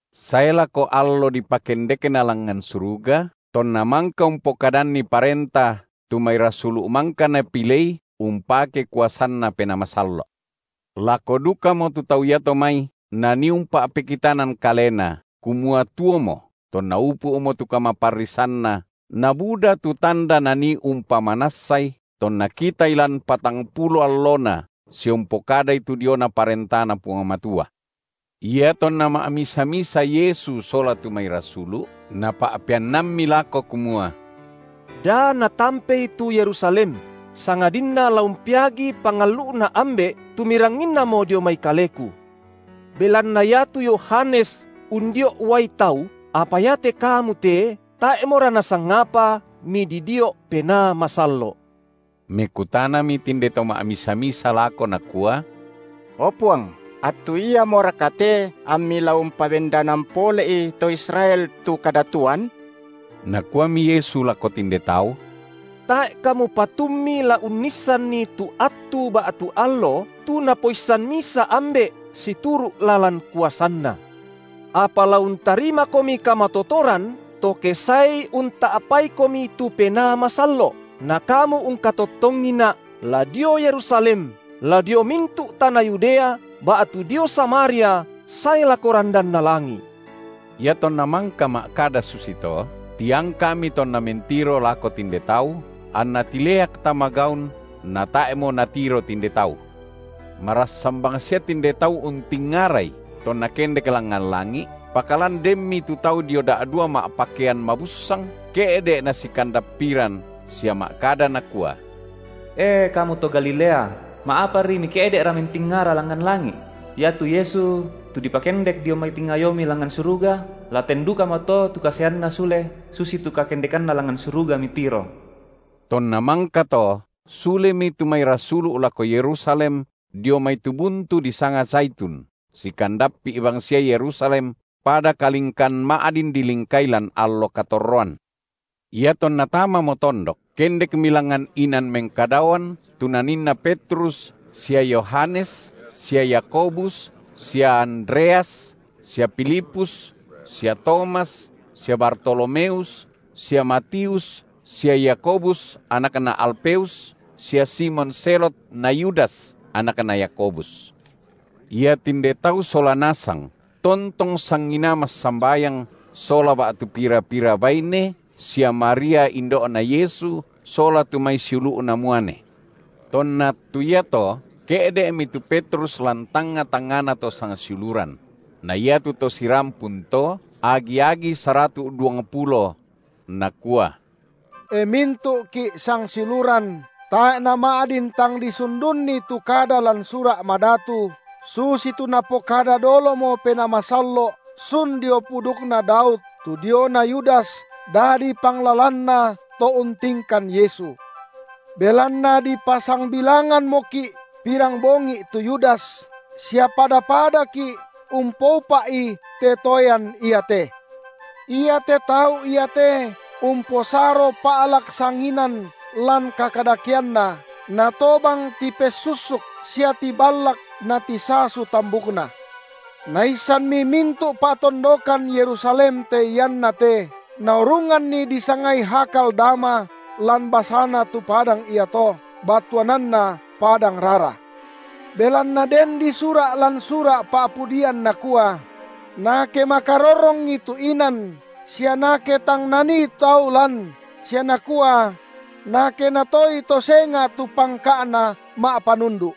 sae lako allo dipakendekNa langngan suruga, tonNa mangka umpokadanni parenta tu mai rasulu’ mangka Napilei umpake kuasanNa Penaa Masallo’. Lako dukamo tu tau iato mai Nanii umpa’pekitanan Kalena, kumua tuomo, tonna upu’mo tu kamaparrisanNa, nabuda tu tanda Nanii umpamanassai, tonna kitaI lan patangpulo allona, sia umpokadai tu diona ParentaNa Puang Matua. Iatonna ma’misa-misa Yesu sola tu mai rasulu’, Napa’peannammi lako kumua da natampei tu Yerusalem, sangadinna la umpeagi pangallu’Na Ambe’ tu miranginnamo dio mai Kaleku; belanna iatu Yohanes undio’ uai tau, apa iate kamu te tae’mora nasangapa mididio’ Penaa Masallo’. Mekutanami tinde to ma’misa-misa lako nakua: O Puang, attu iamoraka te amMi la umpabendanan pole’i to Israel tu kadatuan? Nakuami Yesu lako tinde tau: Tae’ kamu patummi la unnissanni tu attu ba’tu allo, tu Napoissan misa Ambe’ situru’ lalan kuasanNa. Apa la untarimakomi kamatotoran to ke saeI unta’paikomi tu Penaa Masallo’, na kamu ungkatottongiNa’, la dio Yerusalem, la dio mintu’ tana Yudea ba’tu dio Samaria sae lako randanna langi’. Iatonna mangka ma’kada susito, tiangka’Mi tonna mentiro lako tinde tau, anNa tileak tama gaun, natae’mo natiro tinde tau. Marassan bangsia tinde tau untingarai tonNa kendek langngan langi’, pakalan denmi tu tau da’dua ma’pakean mabussang ke’de’ nasikandappiran, sia ma’kada nakua: E kamu to Galilea, ma’apari mike’de’ra mentingara langngan langi’? Iatu Yesu tu dipakendek dio mai tingayomi langngan suruga, la ten dukamoto tu kasaeanNa sule, susitu kakendekanNa langngan suruga mitiro. Tonna mangkato sulemi tu mai rasulu’ lako Yerusalem dio mai tu buntu disanga Zaitun, sikandappi’ bangsia Yerusalem pada kalingkan ma’din dilingkai lan allo katorroan. Iatonna tamamo tondok, kendekmi langngan inan mengkadaoan tu naninna Petrus sia Yohanes sia Yakobus sia Andreas sia Filipus sia Tomas sia Bartolomeus sia Matius sia Yakobus, anakna Alfeus sia Simon Zelot na Yudas, anakna Yakobus. Iatinde tau sola nasang tontong sanginaa massambayang sola ba’tu pira-pira baine sia Maria indo’Na Yesu, sola tu mai siulu’Na muane. Tonna attu iato ke’de’mi tu Petrus lan tangnga-tangngana to sangsiuluran – na iatu to sirampun to, agi-agi saratu’ duangpulo – nakua: E mintu’ki’ sangsiuluran, tae’ nama’din tang disundunni tu kada lan Sura’ Madatu, susitu napokada dolomo Penaa Masallo’ sun dio pudukna Daud tu diona Yudas dadi panglalanna to untingkan Yesu. Belanna dipasangbilangammoki’ pirambongi’ tu Yudas sia pada-padaki’ umpoupa’i te toean iate. Iate tau iate umposaro pa’lak sanginan lan kakadakeanna, natobang tipessussuk sia tiballak natisasu tambukna. Naissanmi mintu’ pa’tondokan Yerusalem te iannate, naurunganni disangai Hakal-Dama lan basana tu padang iato, battuananna Padang rara. Belanna den disura’ lan Sura’ Pa’pudian nakua: Nake makarorrongi tu inan, sia nake tang nanii tau lan, sia nakua: Nake natoei to senga’ tu pangka’na ma’panundu’.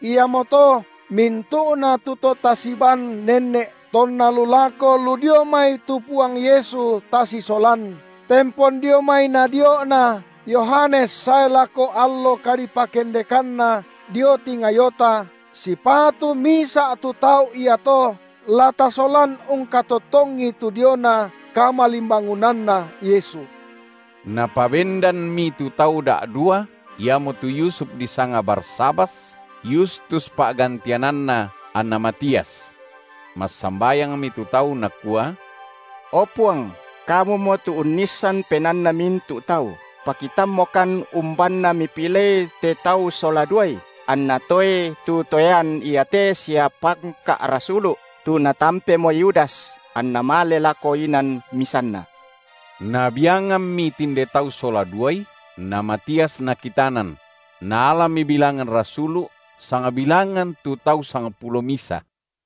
Iamoto mintu’na tu to tasibaan nenne’ tonna lu lako lu dio mai tu Puang Yesu tasisolan, tempon dio mai nadio’Na Yohanes sae lako allo kadipakendekanNa dio tingayota, sipatu misa’ tu tau iato la tasolan ungkatottongi tu diona kamalimbangunanNa Yesu. Napabendanmi tu tau da’dua, iamotu Yusuf disanga Barsabas, Yustus pa’gantiananna, anna Matias. Massambayangmi tu tau nakua: O Puang, Kumumo tu unnissan penaanna mintu’ tau, pakitammokan umbanna Mipilei te tau sola duai, anna toei te toean iate sia pangka’ rasulu’, tu natampemo Yudas, anna male lako inan misanna. Nabiangammi tinde tau sola duai, na Matias nakitanan; naalami bilangan rasulu’, sangbilangan tu tau sangpulo misa.